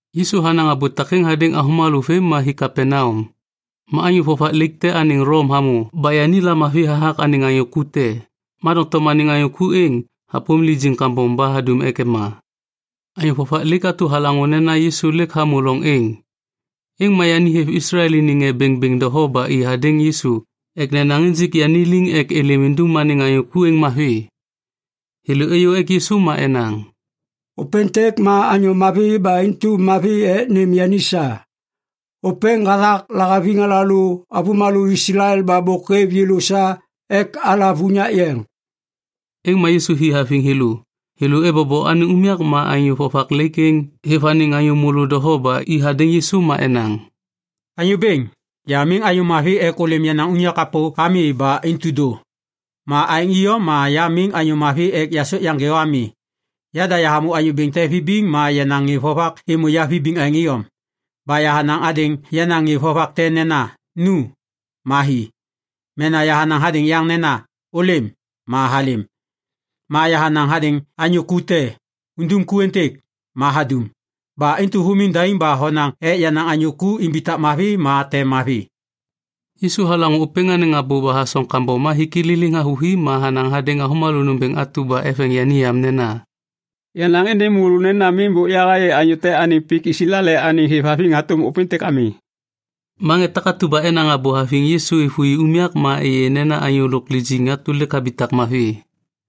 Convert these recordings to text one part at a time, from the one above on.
Yisu hanaŋ abô takêŋ hadêŋ avômalô vêm ma hi Kapaneam. Ma anyô vovak laik te anêŋ Lom hamô ba yani lamavi hathak anêŋ anyô ku te, ma doŋtom anêŋ anyô ku êŋ hapôm lijiŋ kambom ba hadum ek ema. Anyô vovak laik atu halaŋô nena Yisu lêk hamô loŋ êŋ, êŋ ma yani hêv Islael iniŋ ŋê bêŋbêŋ doho ba i hadêŋ Yisu ek nenaŋ injik yani liŋ ek êlêm indum anêŋ anyô ku êŋ mavi. Thêlô êyô ek Yisu ma enaŋ, “Ôpêntêk ma anyô mavi ba intu mavi ek nêm yani sa. Ôpêŋ hathak lahaviŋ alalô avômalô Islael ba bôk hêv yêlô sa ek alav unyak yeŋ.” Êŋ ma Yisu hi haviŋ thêlô. Thêlô ebobo anêŋ unyak ma anyô vovak laik êŋ hêv anêŋ anyô môlô doho ba i hadêŋ Yisu ma enaŋ, “Anyô Bêŋ, ya miŋ anyô mavi ek ôlêm yenaŋ unyak kapô ami ba intu dô. Ma aêŋ iyom ma ya miŋ anyô mavi ek yasôk yaŋgê o ami. Yada yahamô anyô bêŋ te vibiŋ ma yenaŋ ŋê vovak êmô ya vibiŋ aêŋ iyom. Ba yahanaŋ hadêŋ yenaŋ ŋê vovak te nena, ‘Nu’, ma hi. Mena yahanaŋ hadêŋ yaŋ nena, ‘Ôlêm,’ ma halêm. Ma yahanaŋ hadêŋ anyô ku te, ‘Undum ku êntêk,’ ma hadum. Ba intu humiŋ daim ba honaŋ ek yenaŋ anyô ku imbitak mavi ma tem mavi.” Yisu halaŋô ôpêŋ anêŋ abô ba hasoŋ kambom ma hik i liliŋ havôhi ma hanaŋ hadêŋ avômalô nômbêŋ atu ba eveŋ yani yam nena, “Yanaŋ êndêŋ môlô nena miŋ bôk yahayê anyô te anêŋ pik Islael anêŋ hêvhaviŋ hatôm ôpêntêk ami!” Ma ŋê takatu ba enaŋ abô haviŋ Yisu êvôi unyak ma êyê nena anyô lôk lijiŋ atu lêk habitak mavi.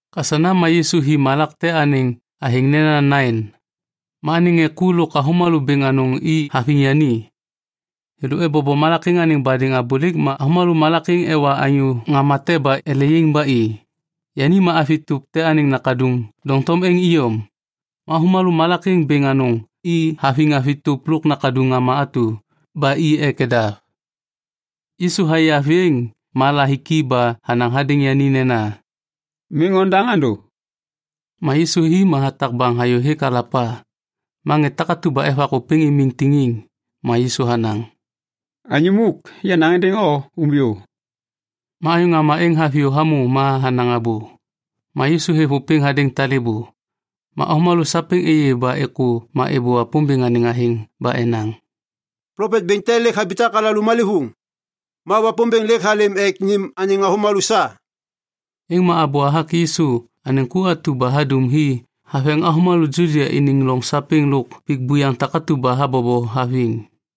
Kasana ma Yisu hi malak te anêŋ athêŋ nena Nain. Ma anêŋ ŋê ku lôk avômalô bêŋ anôŋ i haviŋ yani. Thêlô ebobo malak êŋ anêŋ badêŋ abôlêk ma avômalô malak êŋ ewa anyô ŋama te ba ele yaiŋ ba i. Yani ma avi tôp te anêŋ nakaduŋ doŋtom êŋ iyom. Ma avômalô malak êŋ bêŋ anôŋ i haviŋ avi tôp lôk nakaduŋ ŋama atu ba i ek nedav. Yisu hayê avi êŋ ma lahiki ba hanaŋ hadêŋ yani nena, “Miŋ ondaŋ andô.” Ma Yisu hi ma hatak baŋ hayôhêk alapa, ma ŋê takatu ba evak ôpêŋ imiŋ tiŋiŋ. Ma Yisu hanaŋ, “Anyô muk, yanaŋ êndêŋ o, umbiyô!” Ma anyô ŋama êŋ haviyô hamô ma hanaŋ abô, ma Yisu hêv ôpêŋ hadêŋ talêbô. Ma avômalô sapêŋ êyê ba êkô ma êbô Wapômbêŋ anêŋ athêŋ ba enaŋ, “Plopet bêŋ te lêk habitak alalô malêvôŋ. Ma Wapômbêŋ lêk halêm ek nêm anêŋ avômalô sa.” Êŋ ma abô hathak Yisu anêŋ ku atu ba hadum hi haveŋ avômalô Judia iniŋ loŋ sapêŋ lôk pik buyaŋ takatu ba habobo haviŋ.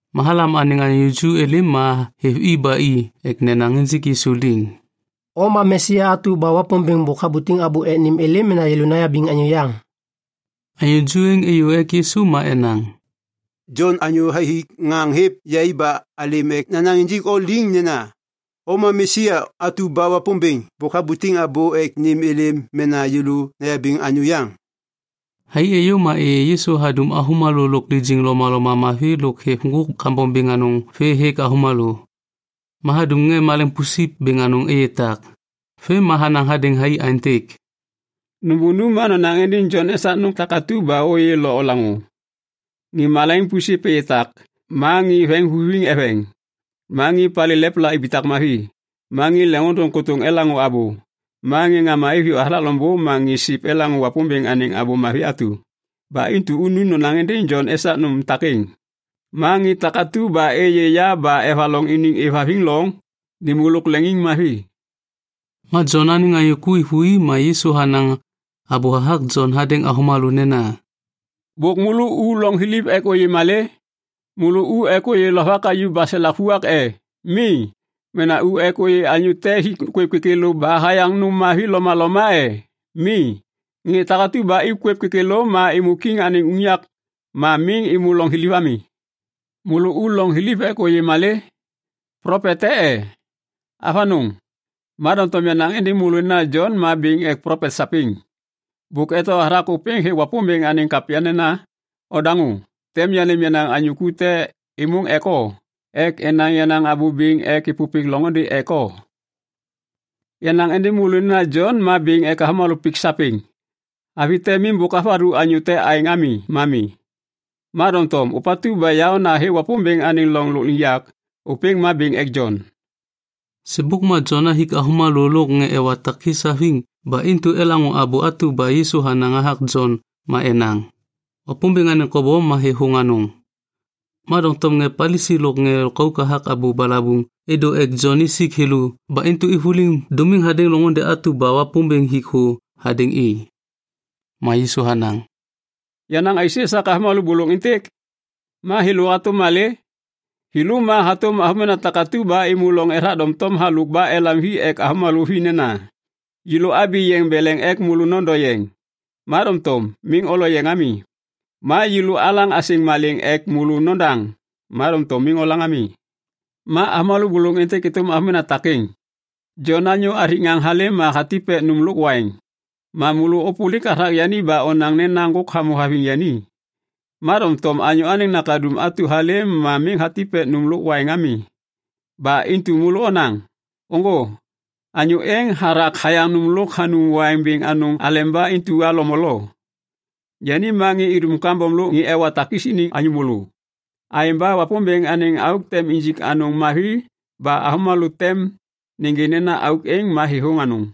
Ma halam anêŋ anyô ju êlêm ma hêv i ba i ek nenaŋ injik Yisu liŋ, “O ma Mesia atu ba Wapômbêŋ bôk habutiŋ abô ek nêm êlêm mena yêlô nayabiŋ anyô yaŋ?” Anyô ju êŋ êyô ek Yisu ma enaŋ, “Jon anyô hathik ŋaŋ hêv yai ba alêm ek nanaŋ injik o liŋ nena, ‘O ma Mesia atu ba Wapômbêŋ bôk habutiŋ abô ek nêm êlêm mena yêlô nayabiŋ anyô yaŋ?’” Thai êyô ma êyê Yisu hadum avômalô lôk lijiŋ lomaloma mavi lôk hêv ŋgôk kambom bêŋ anôŋ vê hêk avômalô. Ma hadum ŋê maleŋiŋ pusip bêŋ anôŋ êyê tak. Vêm ma hanaŋ hadêŋ thai aêntêk, “Nôbônu ma nonaŋ êndêŋ Jon esak nôm takatu ba mamu ôyê lo olaŋô. Ŋê maleŋiŋ pusip êyê tak, ma ŋê veŋiŋvuviŋ eveŋ, ma ŋê palê lepla ibitak mavi, ma ŋê leŋiŋôndôŋ kôtôŋ elaŋô abô, ma ŋê ŋama iviyô hathak loŋbô ma ŋê siv elaŋô Wapômbêŋ anêŋ Abô Mavi atu. Ba intu unu nonaŋ êndêŋ Jon esak nôm takêŋ. Ma ŋê takatu ba êyê ya ba evaloŋ iniŋ êvhaviŋ loŋ, nêmô lôk leŋiŋmavi.” Ma Jon anêŋ anyô ku êvôi ma Yisu hanaŋ abô hathak Jon hadêŋ avômalô nena, “Bôk môlô u loŋ thiliv ek ôyê malê? Môlô u ek ôyê lovak hayuv baselak vuak e? Mi. Mena u ek ôyê anyô te hik kwêv kêkêlô ba hayaŋ nôm mavi lomaloma e? Mi, ŋê takatu ba ik kwêv kêkêlô ma êmô kiŋ anêŋ unyak ma miŋ êmô loŋ thiliv ami. Môlô u loŋ thiliv ek ôyê malê? Plopet te e? Avanôŋ! Ma doŋtom yanaŋ êndêŋ môlô nena Jon ma bêŋ ek plopet sapêŋ. Bôk eto hathak ôpêŋ hêk Wapômbêŋ anêŋ kapya nena, “‘Odaŋô, tem yanêm yenaŋ anyô ku te êmôŋ ek o, ek enaŋ yenaŋ abô bêŋ ek êpôpêk loŋôndê ek o.’ “Yanaŋ êndêŋ môlô nena Jon ma bêŋ ek avômalô pik sapêŋ. Avi te miŋ bôk havathu anyô te aêŋ ami ma mi. Ma doŋtom ôpatu ba yaôna hêk Wapômbêŋ anêŋ loŋ lôkliŋyak, ôpêŋ ma bêŋ ek Jon.” (Sêbôk ma Jon hathik avômalô lôk ŋê ewa takis haviŋ ba intu elaŋô abô atu ba Yisu hanaŋ hathak Jon ma enaŋ, “Wapômbêŋ anêŋ kobom ma thêthôŋ anôŋ.” Ma doŋtom ŋê Palisi lôk ŋê lôkauk hathak abô balabuŋ êdô ek Jon isik thêlô ba intu êvôliŋ dômiŋ hadêŋ loŋôndê atu ba Wapômbêŋ hik thô hadêŋ i.) Ma Yisu hanaŋ, “Yanaŋ aisê esak avômalô bôlôŋ êntêk? Ma thêlô hatôm malê? Thêlô ma hatôm avômena takatu ba êmô loŋ ethak doŋtom halôk ba elam hi ek avômena vi nena, “‘Yêlô abi yeŋ beleŋ ek môlô nondo yeŋ, ma doŋtom miŋ olo yeŋ ami. Ma yêlô alaŋ asêŋ malêŋ ek môlô nodaŋ, ma doŋtom miŋ olaŋ ami.’ “Ma avômalô bôlôŋ êntêk êtôm avômena takêŋ. Jon anyô hathik ŋaŋ halêm ma hatip ek nôm lôk waiŋ. Ma môlô ôpôlik hathak yani ba onaŋ nena ŋgôk hamô haviŋ yani. Ma doŋtom Anyô Anêŋ Nakaduŋ atu halêm ma miŋ hatip ek nôm lo waiŋ ami. Ba intu môlô onaŋ, ‘Ôŋgô, anyô êŋ hathak hayaŋ nôm lôk hanum waiŋ bêŋ anôŋ aleba intu halo molo. Yani ma ŋê idum kambom lôk ŋê ewa takis iniŋ anyô môlô.’ Aêŋ ba Wapômbêŋ anêŋ auk tem injik anôŋ mavi ba avômalô tem nêgê nena auk êŋ ma thêthôŋ anôŋ.”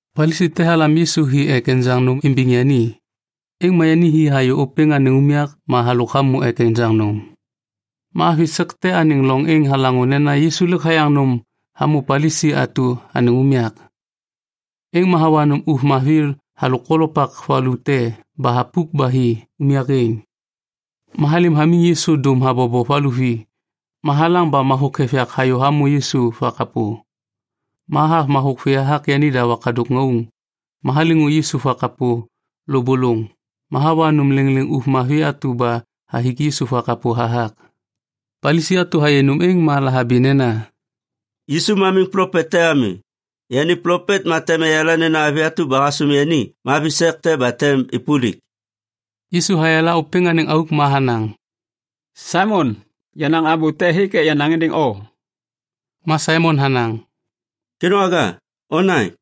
Palisi te halam Yisu hi ek enjaŋ nôm imbiŋ yani. Êŋ ma yani hi hayô ôpêŋ anêŋ unyak ma halôk hamô ek enjaŋ nôm. Ma avi sek te anêŋ loŋ êŋ halaŋô nena Yisu lêk hayaŋ nôm hamô Palisi atu anêŋ unyak. Êŋ ma hawa nôm ôv mavi halôk kolopak valu te ba thapuk ba hi unyak êŋ. Ma halêm hamiŋ Yisu dôm habobo valuvi ma halaŋ ba mathôk hêv yak hayô hamô Yisu vakapô. Ma hathav mathôk vê hathak yanida wakadôk ŋauŋ. Ma haliŋu Yisu vakapô lôbôlôŋ ma hawa nôm lêŋlêŋ ôv mavi atu ba hathik Yisu vakapô hathak. Palisi atu hayê nôm êŋ ma lahabi nena, “Yisu ma miŋ plopet te ami. Yani plopet ma tem eyala nena avi atu ba hasôm yani ma avi sek te ba tem êpôlik.” Yisu hayala ôpêŋ anêŋ auk ma hanaŋ, “Saimon, yenaŋ abô te hêk ek yanaŋ êndêŋ o.” Ma Saimon hanaŋ, “Kêdôŋwaga, onaŋ.”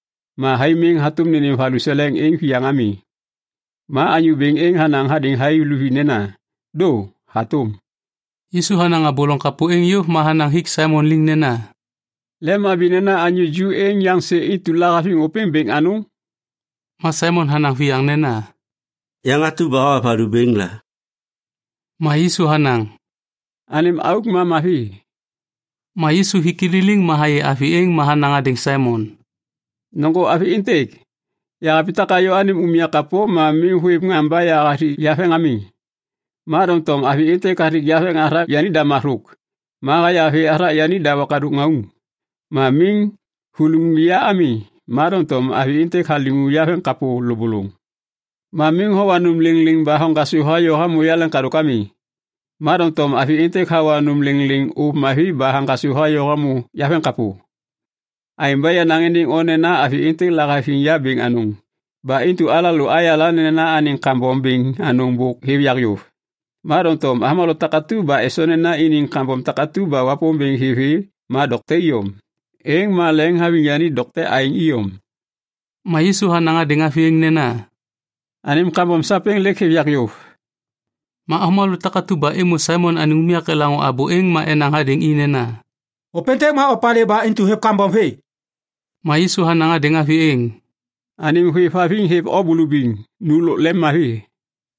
Ma thai miŋ hatôm nênêm valuseleŋ êŋ viyaŋ ami. Ma anyô bêŋ êŋ hanaŋ hadêŋ thai luvi nena, ‘Dô, hatôm.’” Yisu hanaŋ abô loŋ kapô êŋ yôv ma hanaŋ hik Saimon liŋ nena, “Lemhabi nena anyô ju êŋ yaŋsê intu lahaviŋ ôpêŋ bêŋ anôŋ?” Ma Saimon hanaŋ viyaŋ nena, “Yaŋ atu ba hawa valu bêŋ la.” Ma Yisu hanaŋ, “Anêm auk ma mavi.” Ma Yisu hik i liliŋ ma hayê avi êŋ ma hanaŋ hadêŋ Saimon, “Nôŋgô avi êntêk. Yahabitak hayô anêm unyak kapô ma miŋ hôêv ŋaŋ ba yahathik yaveŋ ami. Ma doŋtom avi êntêk hathik yaveŋ hathak yanida mathôk ma haya vê hathak yanida wakadôk ŋauŋ. Ma miŋ huliŋu ya ami, ma doŋtom avi êntêk haliŋu yaveŋkapô lôbôlôŋ. Ma miŋ howa nôm lêŋlêŋ ba hoŋgasô hayô hamô yaleŋkadôk ami, ma doŋtom avi êntêk hawa nôm lêŋlêŋ ôv mavi ba haŋgasô hayô hamô yaveŋkapô. Aêŋ ba yanaŋ êndêŋ o nena avi êntêk lahaviŋ ya bêŋ anôŋ ba intu alalô ayala nena anêŋ kambom bêŋ anôŋ bôk hêv yak yôv. Ma doŋtom avômalô takatu ba esoŋ nena iniŋ kambom takatu ba Wapômbêŋ hêv vê ma dokte iyom, êŋ ma leŋiŋhaviŋ yani dokte aêŋ iyom.” Ma Yisu hanaŋ hadêŋ avi êŋ nena, “Anêm kambom sapêŋ lêk hêv yak yôv.” Ma avômalô takatu ba êmô Saimon anêŋ unyak elaŋô abô êŋ ma enaŋ hadêŋ i nena, “Ôpêntêk ma opalê ba intu hêv kambom vê?” Ma Yisu hanaŋ hadêŋ avi êŋ, “Anêm hôêvhaviŋ hêv o bulubiŋ. Nu lôk lemmavi.”